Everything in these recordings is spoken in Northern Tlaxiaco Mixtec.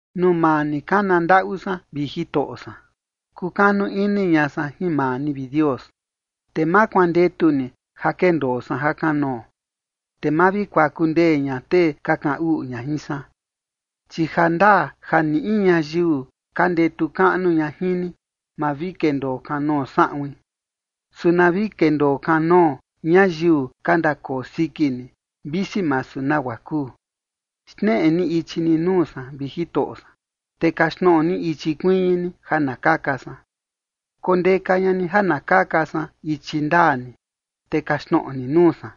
Nuu maa ni kana ndaꞌu san, vi Jitoꞌo san. Kukanu ini ña san jin maa ni, vi Dios, te ma kuandetu ni ja kendoo san ja kanoo, te ma vi kuaku ndee ña tee ka kaꞌan uꞌu ña jin san. Chi jandaa ja ni in ñayiu ka ndetu kaꞌnu ña jin ni, ma vi kendoo kanoo saꞌuin, su na vi kendoo kanoo ñayiu ka ndakoo siki ni, visi masu nagua kuu. Xneꞌe ni ichi ni nuu san, vi Jitoꞌo san, te kaxtnoꞌo ni ichi kuiñi ni ja na kaka san. Kondeka ña ni ja na kaka san ichi ndaa ni, te kaxtnoꞌo ni nuu san,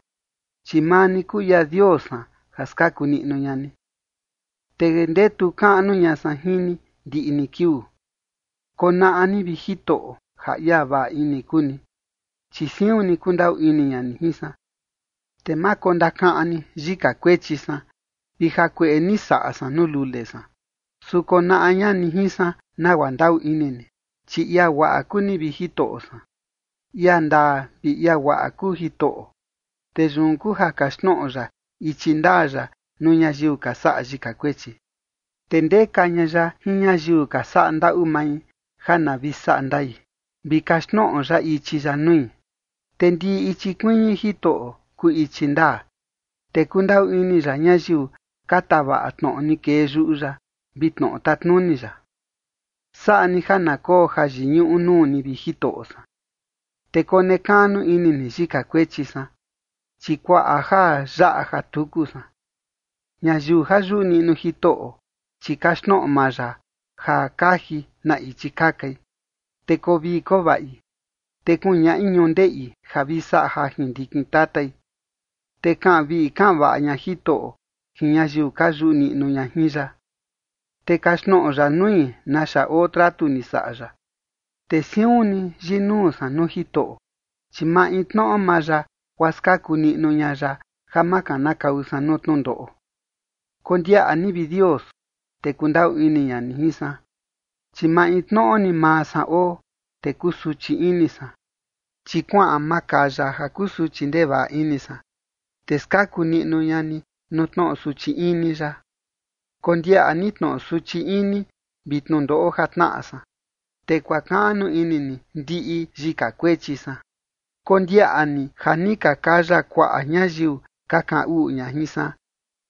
chi maa ni kuu ia Dios san ja skaku niꞌnu ña ni, te ndetu kaꞌnu ña san jin ni ndiꞌi ni kiuu. Konaꞌa ni, vi Jitoꞌo, ja ia vaꞌa ini kuu ni, chi siun ni kundaꞌu ini ña ni jin san. Te ma kondakaꞌan ni yika kuechi san vi jakueꞌe ja ni saꞌa san nuu lule san, su konaꞌa ña ni jin san nagua ndaꞌu ini ni, chi ia guaꞌa kuu ni, vi Jitoꞌo san. Ia ndaa vi ia guaꞌa kuu Jitoꞌo, te yun kuu ja kaxtnoꞌo ya ichi ndaa ya nuu ñayiu ka saꞌa yika kuechi. Te ndeka ña ya jin ñayiu ka saꞌa ndaꞌu mai ja na vi saꞌa ndai, vi kaxtnoꞌo ya ichi ya nui. Te ndiꞌi ichi kuiñi Jitoꞌo kuu ichi ndaa, te kundaꞌu ini ya ñayiu ka tavaꞌa tnoꞌo ni kee yuꞌu ya vi tnoꞌo tatnuni ya. Saꞌa ni ja na koo jayiñuꞌu nuu ni, vi Jitoꞌo san, te konekaꞌnu ini ni yika kuechi san, chi kuaꞌa ja yaꞌa ja tuku san. Ñayiu ja yuꞌu niꞌnu Jitoꞌo, chi kaxtnoꞌo maa ya ja kaji na ichi kakai. Te koo vii koo vaꞌi, te kuñaꞌi ñundeꞌi ja vi saꞌa jajin ndikin tatai. Te kaꞌan vii kaꞌan vaꞌa ña Jitoꞌo jin ñayiu ka yuꞌu niꞌnu ña jin ya, te kaxtnoꞌo ya nui naxa oo tratu ni saꞌa ya. Te siun ni yinuu san nuu Jitoꞌo, chi maintnoꞌo maa ya, guaa skaku niꞌnu ña ya ja ma kanakau san nuu tnundoꞌo. Kondiaꞌa ni, vi Dios, te kundaꞌu ini ña ni jin san, chi maintnoꞌo ni maa san oo, te kusuchi ini san. Chi kuaꞌan makaya ja kusuchi ndevaꞌa ini san, te skaku niꞌnu ña ni nuu tnoꞌo suchi ini yaꞌa. Kondiaꞌa ni tnoꞌo suchi ini vi tnundoꞌo ja tnaꞌa san, te kuakaꞌnu ini ni ndiꞌi yika kuechi san. Kondiaꞌa ni ja ni ka kaya kuaꞌa ñayiu ka kaꞌan uꞌu ña jin san,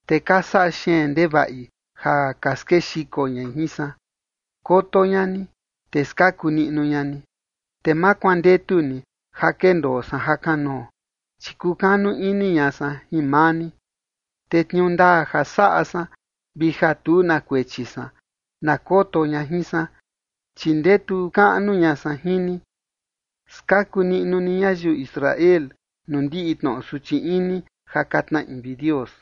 te ka saꞌa xeen ndevaꞌi ja ka skexiko ñai jin san. Koto ña ni, te skaku niꞌnu ña ni, te ma kuandetu ni ja kendoo san ja kanoo, chi kukanu ini ña san jin maa ni. Te tniuu ndaa ja saꞌa san vi ja tu na kuechi san, na koto ña jin san, chi ndetu kaꞌnu ña san jin ni. Skaku niꞌnu ni ñayiu Israel nuu ndiꞌi tnoꞌo suchi ini ja ka tnaꞌi, vi Dios.